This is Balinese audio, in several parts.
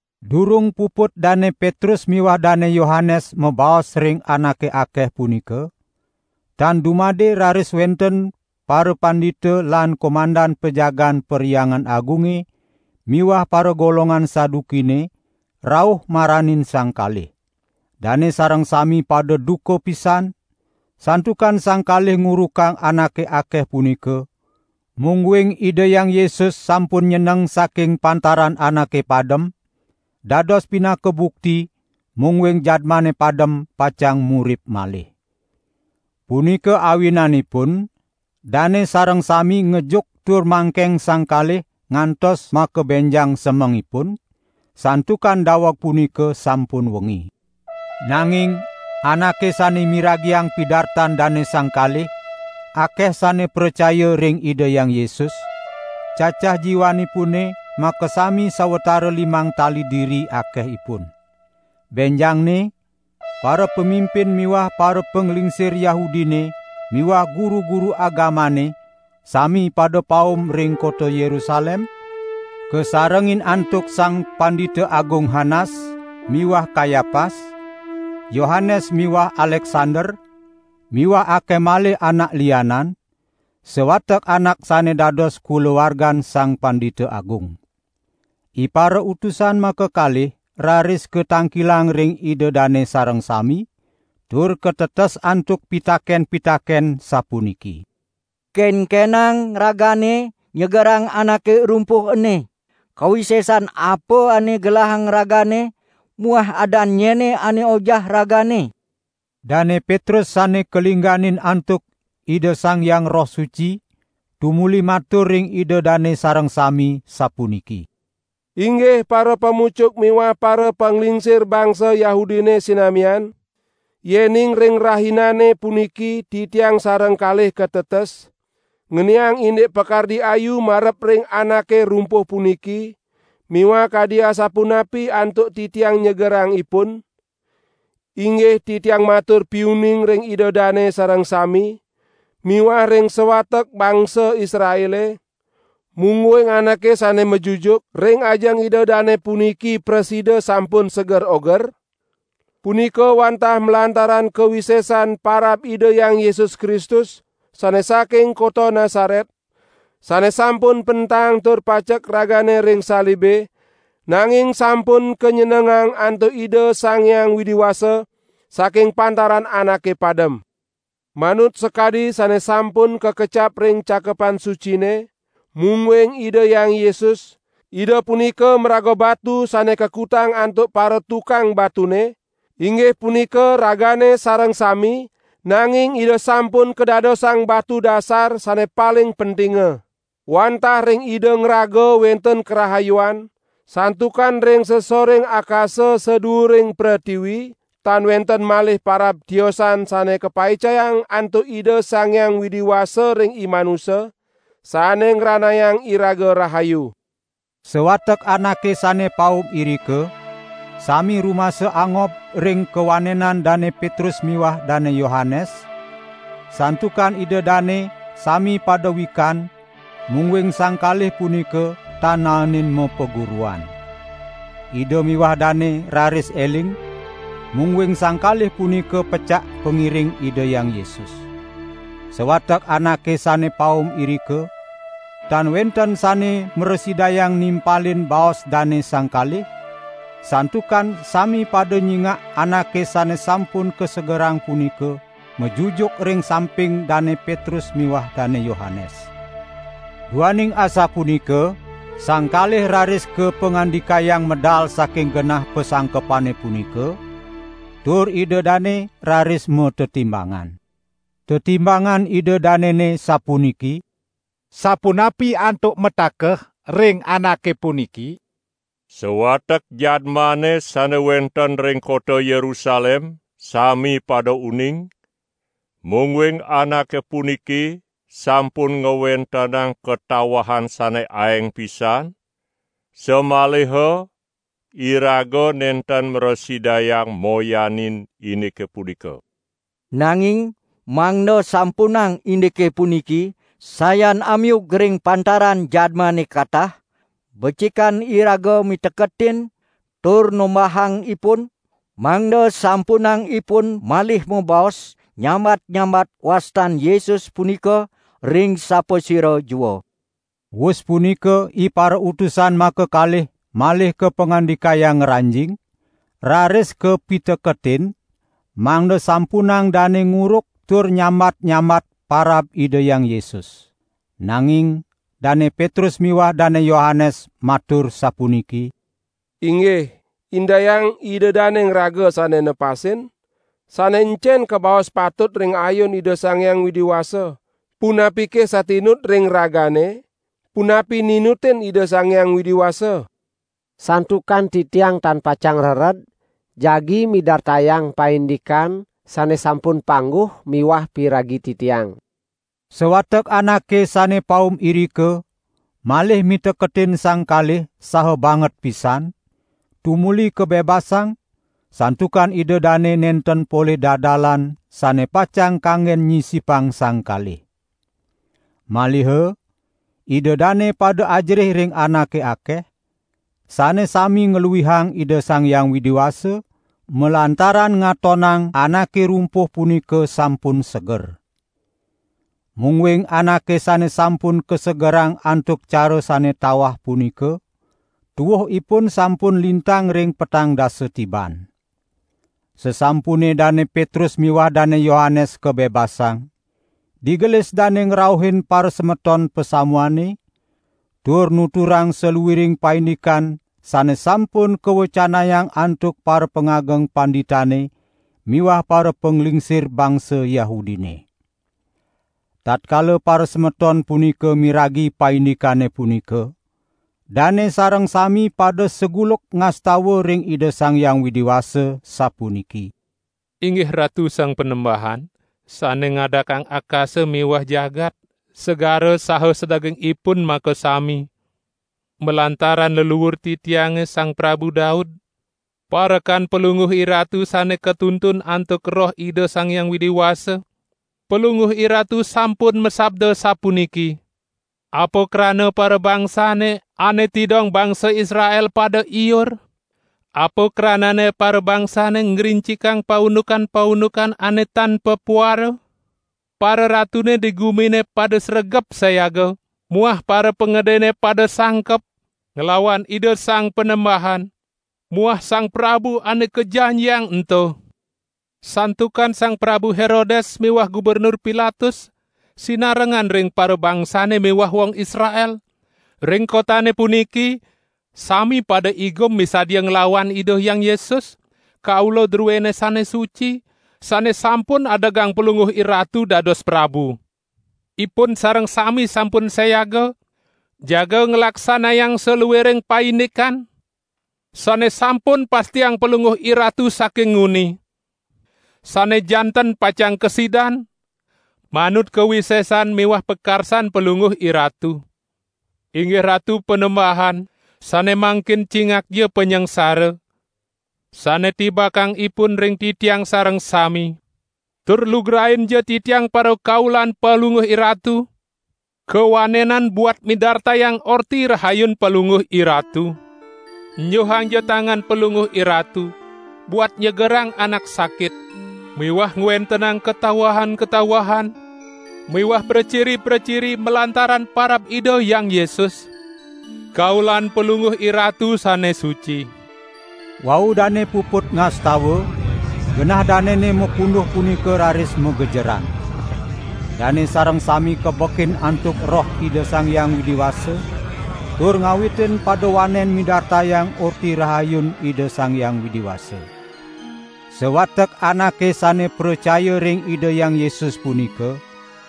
Durung puput Dane Petrus miwah Dane Yohanes mabaos ring anake akeh punika, tan dumade raris wenten parapandita lan komandan pajagaan Perhyangan Agunge miwah paragolongan Sadukine rauh maranin sang kalih. Dane sareng sami pada duka pisan, santukan sang kalih ngurukang anake akeh punika, mungguing Ida Hyang Yesus sampun nyeneng saking pantaran anake padem, dados pinaka bukti mungguing jadmane padem pacang murip malih. Punika awinanipun dane sareng sami ngejuk tur mangkeng sang kalih ngantos makabenjang semengipun, santukan daweg punika sampun wengi. Nanging anake sane miragiang pidartan dane sang kalih, akeh sane pracaya ring Ida Hyang Yesus; cacah jiwanipune makasami sawatara limang tali diri akehipun. Benjangne parapamimpin miwah parapanglingsir Yahudine miwah guru-guru agamane sami pada paum ring kota Yerusalem, kasarengin antuk Sang Pandita Agung Hanas miwah Kayapas, Yohanes miwah Aleksander miwah akeh malih anak lianan, sawatek anak sane dados kulawargan Sang Pandita Agung. Iparautusan makakalih raris katangkilang ring ida dane sareng sami, tur katetes antuk pitaken-pitaken sapuniki: "Kenkenang ragane nyegerang anake rumpuh ene? Kawisesan apa ane gelahang ragane muah adan nyene ane ojah ragane?" Dane Petrus sane kalingganin antuk Ida Sang Hyang Roh Suci, tumuli matur ring ida dane sareng sami, sapuniki: "Inggih parapamucuk miwah parapanglingsir bangsa Yahudine sinamian. Yening ring rahinane puniki titiang sareng kalih katetes ngeniang indik pakardi ayu marep ring anake rumpuh puniki miwah kadi asapunapi antuk titiang nyegerang ipun, inggih titiang matur piuning ring ida dane sareng sami miwah ring sawatek bangsa Israele, mungguing anake sane majujuk ring ajeng ida dane puniki prasida sampun seger oger, punika wantah malantaran kawisesan parab Ida Hyang Yesus Kristus sane saking kota Nasaret, sane sampun pentang tur pacek ragane ring salibe, nanging sampun kanyenengang antuk Ida Sang Hyang Widi Wasa saking pantaran anake padem. Manut sakadi sane sampun kakecap ring Cakepan Sucine: Mungguing Ida Hyang Yesus, Ida punika maraga Batu sane kakutang antuk paratukang batune, inggih punika ragane sareng sami, nanging Ida sampun kadadosang batu dasar sane paling pentinga.' Wantah ring Ida ngraga wenten karahayuan; santukan ring sasoring akasa saduuring pretiwi tan wenten malih parab tiosan sane kapaicayang antuk Ida Sang Hyang Widi Wasa ring imanusa, sane ngranayang iraga rahayu." Sawatek anake sane paum irika sami rumasa angob ring kawanenan Dane Petrus miwah Dane Yohanes, santukan ida dane sami pada wikan mungguing sang kalih punika tan naenin mapaguruan. Ida miwah dane raris eling, mungguing sang kalih punika pecak pangiring Ida Hyang Yesus. Sawatek anake sane paum irika, tan wenten sane mrasidayang nimpalin baos dane sang kalih, santukan sami pada nyingak anake sane sampun kasegerang punika majujuk ring samping Dane Petrus miwah Dane Yohanes. Duaning asapunika sang kalih raris kapangandikayang medal saking genah pasangkepane punika, tur ida dane raris matetimbangan. Tetimbangan ida danene sapuniki: "Sapunapi antuk matakeh ring anake puniki? Sawatek jadmane sane wenten ring kota Yerusalem sami pada uning, mungguing anake puniki sampun ngwentenang katawahan sane aeng pisan, samaliha iraga nenten mrasidayang moyanin indike punika. Nanging mangda sampunang indike puniki sayan amiug ring pantaran jadmane katah, becikan iraga miteketin tur nombahang ipun, mangda sampunang ipun malih mabaos nyambat-nyambat wastan Yesus punika ring sapasira jua." Wus punika iparautusan makakalih malih kapangandikayang ngranjing, raris kapiteketin mangda sampunang dane nguruk tur nyambat-nyambat parab Ida Hyang Yesus. Nanging Dane Petrus miwah Dane Yohanes matur sapuniki: "Inggih, indayang ida dane ngraga sane nepasin, sane encen kabaos patut ring ayun Ida Sang Hyang Widi Wasa, punapike satinut ring ragane, punapi ninutin Ida Sang Hyang Widi Wasa? Santukan titiang tan pacang rered jagi midartayang paindikan sane sampun pangguh miwah piragi titiang." Sawatek anake sane paum irika malih miteketin sang kalih saha banget pisan, tumuli kabebasang, santukan ida dane nenten polih dadalan sane pacang kanggen nyisipang sang kalih. Maliha ida dane pada ajerih ring anake akeh, sane sami ngluihang Ida Sang Hyang Widi Wasa, malantaran ngatonang anake rumpuh punika sampun seger. Mungguing anake sane sampun kasegerang antuk cara sane tawah punika, tuuh ipun sampun lintang ring petang dasa tiban. Sasampune Dane Petrus miwah Dane Yohanes kabebasang, digelis dane ngrauhin parasemeton pasamuane, tur nuturang saluiring paindikan sane sampun kawecanayang antuk parapangageng panditane miwah parapanglingsir bangsa Yahudine. Tatkala parasemeton punika miragi paindikane punika, dane sareng sami pada saguluk ngastawa ring Ida Sang Hyang Widi Wasa, sapuniki: "Inggih Ratu Sang Panembahan, sane ngadakang akasa miwah jagat, segara saha sadagingipun makasami! Malantaran leluur titiange Sang Prabu Daud, parekan Palungguh IRatu sane katuntun antuk Roh Ida Sang Hyang Widi Wasa, Palungguh IRatu sampun masabda sapuniki: Apa krana parabangsane ane tidong bangsa Israel pada iur? Apa kranane parabangsane ngrincikang paundukan-paundukan ane tan papuara? Pararatune di gumine pada sregep sayaga muah parapangedene pada sangkep, nglawan Ida Sang Panembahan muah Sang Prabu Ane Kajanjiang ento.' Santukan Sang Prabu Herodes miwah Gubernur Pilatus sinarengan ring parabangsane miwah wong Israel, ring kotane puniki sami pada igum misadia nglawan Ida Hyang Yesus, Kaula druene sane suci, sane sampun adegang Palungguh IRatu dados Prabu. Ipun sareng sami sampun sayaga jaga nglaksanayang saluiring paindikan sane sampun pastiang Palungguh IRatu saking nguni, sane janten pacang kasidan, manut kawisesan miwah pakarsan Palungguh IRatu. Inggih Ratu Panembahan, sane mangkin cingakja panyangsara sane tibakang ipun ring titiang sareng sami; tur lugrainja titiang parakaulan Palungguh IRatu, kawanenan buat midartayang Orti Rahayun Palungguh IRatu. Enjuhangja tangan Palungguh IRatu buat nyegerang anak sakit miwah ngwentenang katawahan-katawahan miwah praciri-praciri malantaran parab Ida Hyang Yesus, Kaulan Palungguh IRatu sane suci." Wau dane puput ngastawa, genah danene mapunduh punika raris magejeran. Dane sareng sami kabekin antuk Roh Ida Sang Hyang Widi Wasa, tur ngawitin pada wanen midartayang Orti Rahayun Ida Sang Hyang Widi Wasa. Sawatek anake sane pracaya ring Ida Hyang Yesus punika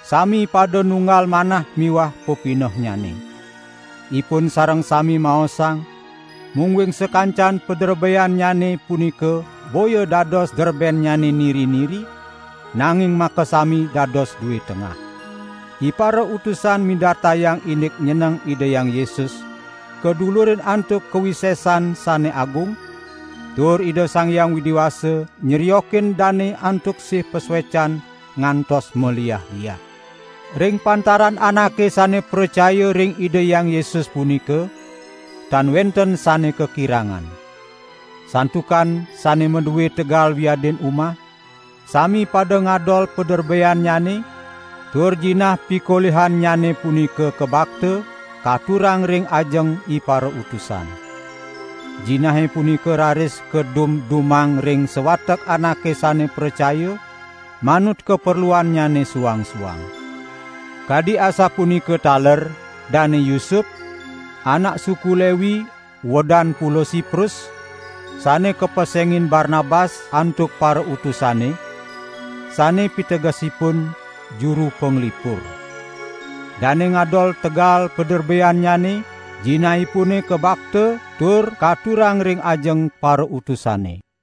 sami pada nunggal manah miwah pepinehnyane. Ipun sareng sami maosang, mungguing sakancan paderbeannyane punika boya dados derbennyane niri-niri, nanging makasami dados due tengah. Iparautusan midartayang indik nyeneng Ida Hyang Yesus kadulurin antuk kawisesan sane agung, tur Ida Sang Hyang Widi Wasa nyriokin dane antuk sih pasuecan ngantos maliah-liah. Ring pantaran anake sane pracaya ring Ida Hyang Yesus punika tan wenten sane kakirangan. Santukan sane madue tegal wiadin umah, sami pada ngadol paderbeannyane, tur jinah pikolihannyane punika kabakta, katurang ring ajeng iparautusan. Jinahe punika raris kadum-dumang ring sawatek anake sane pracaya, manut kaperluannyane suang-suang. Kadi asapunika taler Dane Yusup anak suku Lewi uedan Pulo Siprus, sane kapesengin Barnabas antuk parautusane, (sane pitegesipun: Juru panglipur). Dane ngadol tegal paderbeannyane, jinahipune kabakta tur katurang ring ajeng parautusane.